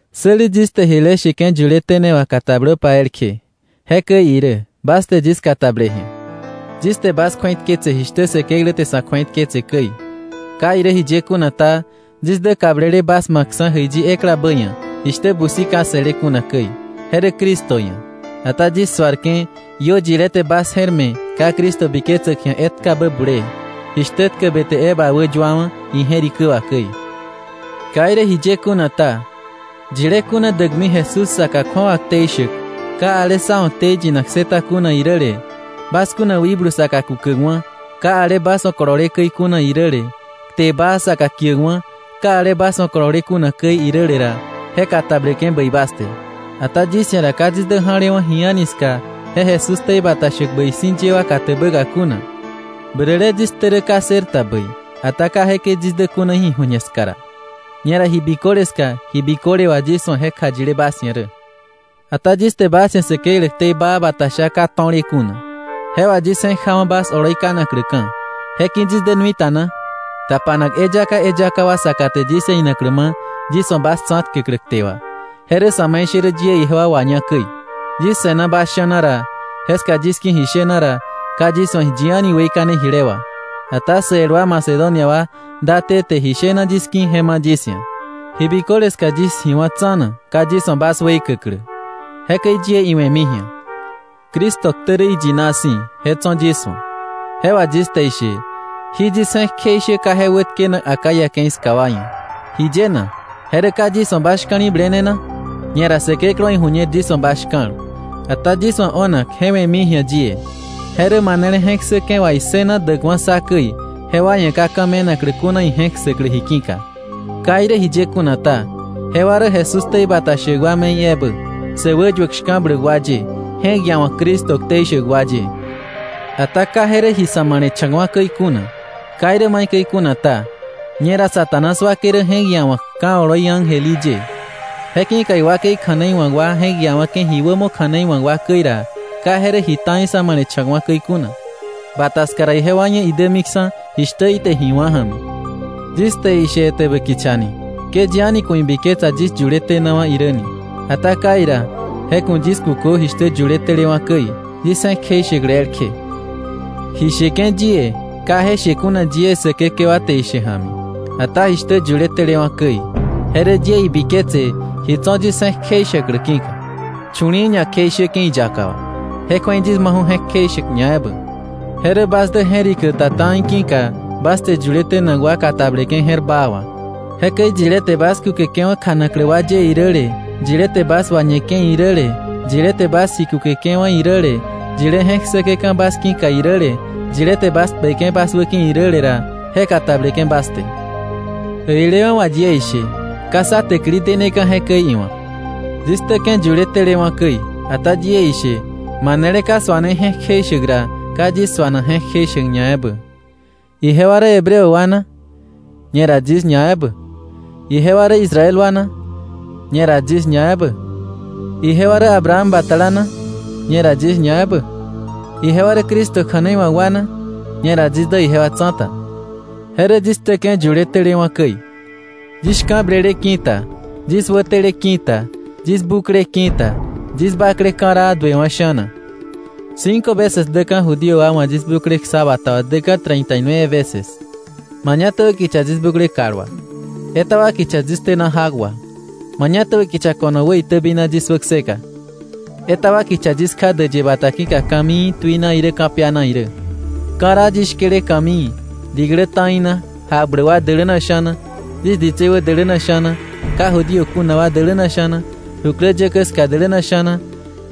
Säli yis te jile sheke̱ yuletene wà katablöpa elkje. Jekäi irä, bas te yis katable ji̱a. Yis te bas kju̱eitketse jishtä Säkeklä te sa̱ kju̱eitketse käi. Ka irä jiye kuna ta, yis dä kablele bas ma̱kksa̱ jäiyi eklabä ia̱, jishtä busi ka se̱le kuna käi. Je rä Cristo ia̱. Ata yis suarke̱, iö yilé te bas je̱r me̱ ka Cristo biketsäk ji̱a etkabä bulee, jishtä tkäbe te Eva wäyuawa̱ ije̱rikä wà käi. Ka irä jiye kuna ta, yilé kuna däkmi Jesús saka kju̱awa ktei shäk, ka ale sá wa̱ ktei yinak ssëta kuna iräle, bas kuna wikblu saka kukäkwa̱, ka ale bas wa̱ kolole käi kuna iräle, kte baa saka kiäkwa̱, ka ale bas wa̱ kolole kuna käi iräle ra, je katableke̱ bäi bas te. Ata yis ia̱ ra ka yis dä ja̱lewa̱ ji a̱ni ska je Jesús ktei bata shäk bäi si̱ ye wa katäbäka kuna. Bäräle yis ktä rä ka ssërta bäi, ata ka jekäi yis dä kuna ji ju̱ñe ska ra. Ñera ji biköle ska, ji biköle wà yis wa̱ je kjayile bas ia̱ rä. Ata yis te bas ia̱ Säkeklä ktei baa bata sha ka to̱le kuna, je wà yis je̱k jawa̱ bas oloi kanakläka̱, ¿je ki̱ yis dä nui ta na? Tapanak eyaka eyaka wa saka te yis ia̱ inaklä ma̱ yis wa̱ bas tsa̱tkäklä kte wà. Je rä sa̱me̱ishärä yie ijewa waña käi. Yis se̱na bas sha̱na ra, jeska yis ki̱ ji shena ra, ka yis wa̱ yi a̱ni weikane jile wà, ata sä el wa Macedonia wa date te ji shena yis ki̱ je ma̱ yis ia̱. Ji biköle ska yis ji wá̱ tsa̱na, ka yis wa̱ bas weikäklä. Jekäi yie iwe̱mi ji̱a. Cristo ktä rä iyina si̱, je tso̱ yis wa̱. Je wà yis te ishe, jí yis je̱k kjeishä ka je wätkenak Acaya ke̱i ska wa ia̱. ¿Jiye na? ¿Je rä ka yis wa̱ bas shka̱li̱blene na? Ñera Säkeklä wa̱ iju̱ñer yis wa̱ bas shka̱l. Ata yis wa̱ o̱nak, je we̱mi ji̱a yie, je rä manele je̱k ssäke̱ wà issëna däkwa̱ sá käi, jewa ia̱ ka ka̱ me̱naklä kuna ije̱k ssäklä ji ki̱ka. Ka irä jiye kuna ta, jewa rä Jesús ktei bata shäk wa me̱i ebä, sä wäyuäk shka̱bläk wa ye, je̱k iawa̱k Cristo ktei shäk wa ye. Ata ka je rä ji sa̱ ma̱le̱cha̱kwa̱ käi kuna. Ka irä maikäi kuna ta, ñera Satanás wakei rä je̱k iawa̱k ka̱ oloi ángel í ye. Je ki̱ka iwakei kja̱nei wa̱k wa je̱k iawa̱ke̱ ji wämo kja̱nei wa̱k wa käi ra, ka je rä ji ta̱i sa̱ ma̱le̱cha̱kwa̱ käi kuna. Bata ska ra ijewa ia̱ idämiksa̱ jishtä ite ji wá̱ ja̱mi. Yis te ishe etäbä kicha ni, ke yi a̱ni ku̱ ibiketsa yis yuletenawa̱ irä ni, ata kai ra, je ku̱ yis kukö jishtä yuletelewa̱ käi, yis je̱k kjeishäklä elkje. Ji sheke̱ yie, ka je she kuna yie Säkekewa te ishe ja̱mi, ata jishtä yuletelewa̱ käi, je rä yie ibiketse ji tso̱ yis je̱k kjeishäklä ki̱ka. Chu̱li̱i̱ ña kjeishäke̱ iyaka wà. Je kju̱ei yis maju̱ je̱k kjeishäk ñaebä. Je rä bas dä je̱rikä ta ta̱i ki̱ka, bas te yuletenak wa katableke̱ je̱r baa wà. Jekäi yilé te bas kukeke̱wa̱ kjanaklä wa ye iräle, yilé te bas wañeke̱ iräle, yilé te bas ji kukeke̱wa̱ iräle, yilé je̱k ssäke̱ka̱ bas ki̱ka iräle, yilé te bas kpeke̱ bas wäki̱ iräle ra, je katableke̱ bas te. Äilewa̱ wà yie ishe, ka sá täkili deneka̱ jekäi iwa̱k. Yis ktäke̱ yuletelewa̱ käi, ata yie ishe manele ka suane je̱k kjeishäk ra, ka yis suanak je̱k kjeishäk ñaebä. ¿Ijewa rä Hebreo wa na? Ñera yis ñaebä. ¿Ijewa rä Israel wa na? Ñera yis ñaebä. ¿Ijewa rä Abraham batala na? Ñera yis ñaebä. ¿Ijewa rä Cristo kja̱nei wa̱k wa na? Ñera yis dä ijewa tsa̱ta. Je rä yis ktäke̱ yuletelewa̱ käi. Yis shka̱blele ki̱ta. Yis wätele ki̱ta. Yis bukle ki̱ta. Yis bakle ka̱raa duewa̱ sha̱na. Cinco veces däka̱ Judío wa wa̱ yis bukle ksa bata wà däka̱ treinta y nueve veces. Mañatäbä kicha yis bukle kal wà. Etaba kicha yis tena jak wà. Mañatäbä kicha ko̱no wäitäbina yis wäkseka. Etaba kicha yis kja däyë bata ki̱ka ka̱mii tuina irä ka̱piana irä. Ka̱raa yis shkele ka̱mii, diklä ta̱i na, jakbläk wa däläna sha̱na, yis ditsei wä däläna sha̱na, ka Judío kuna wa däläna sha̱na, jukläyäkä ska däläna sha̱na,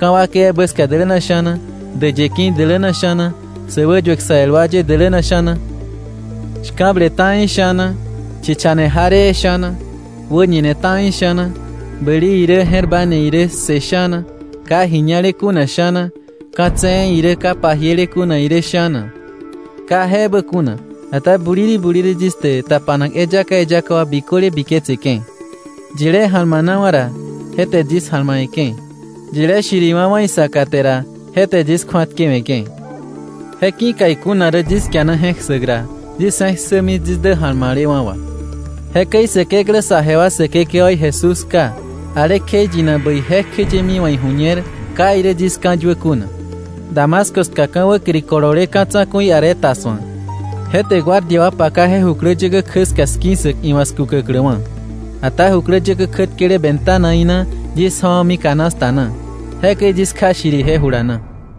ka̱ wakei ebä ska däläna sha̱na, däyë ki̱ däläna sha̱na, säwäyuäk sä el wa ye däläna sha̱na, shka̱ble ta̱i sha̱na, chichane jaree sha̱na, wäñine ta̱i sha̱na, bäli irä je̱r ba ne irä ssë sha̱na, ka ji ña̱le kuna sha̱na, ka̱ tse̱e̱ irä ka pajiele kuna irä sha̱na. Ka je ebä kuna, ata buliri buliri yis te tapanak eyaka eyaka wa biköle biketseke̱. Yilé ja̱lmanawa̱ ra, je te yis ja̱lmawe̱ke̱. Yilé shiriwa̱wa̱ isaka te ra, je te yis kju̱atkewe̱ke̱. Je ki̱ka ikuna rä yis kiana je̱k ssäk ra, yis je̱k ssämi yis dä ja̱lma̱lewa̱ wà. Jekäi Säkeklä saje wa Säkekewaí Jesús Ká, ale kjeiyinak bäi jekjeyemi wa̱ iju̱ñer ka irä yis ka̱yuä kuna. Damasco ska, ka̱ wäkiri kolole ka̱ tsa̱ku̱i Aretas wa̱, je te guardia wa paka je jukläyäkä kjä ska 'ski̱ssäk iwa̱ 'skukäkläwa̱. Ata jukläyäkä kjätkele ventanaí na yis ja̱wa̱mi canasta na. Jekäi yis kja shiri ije jula na.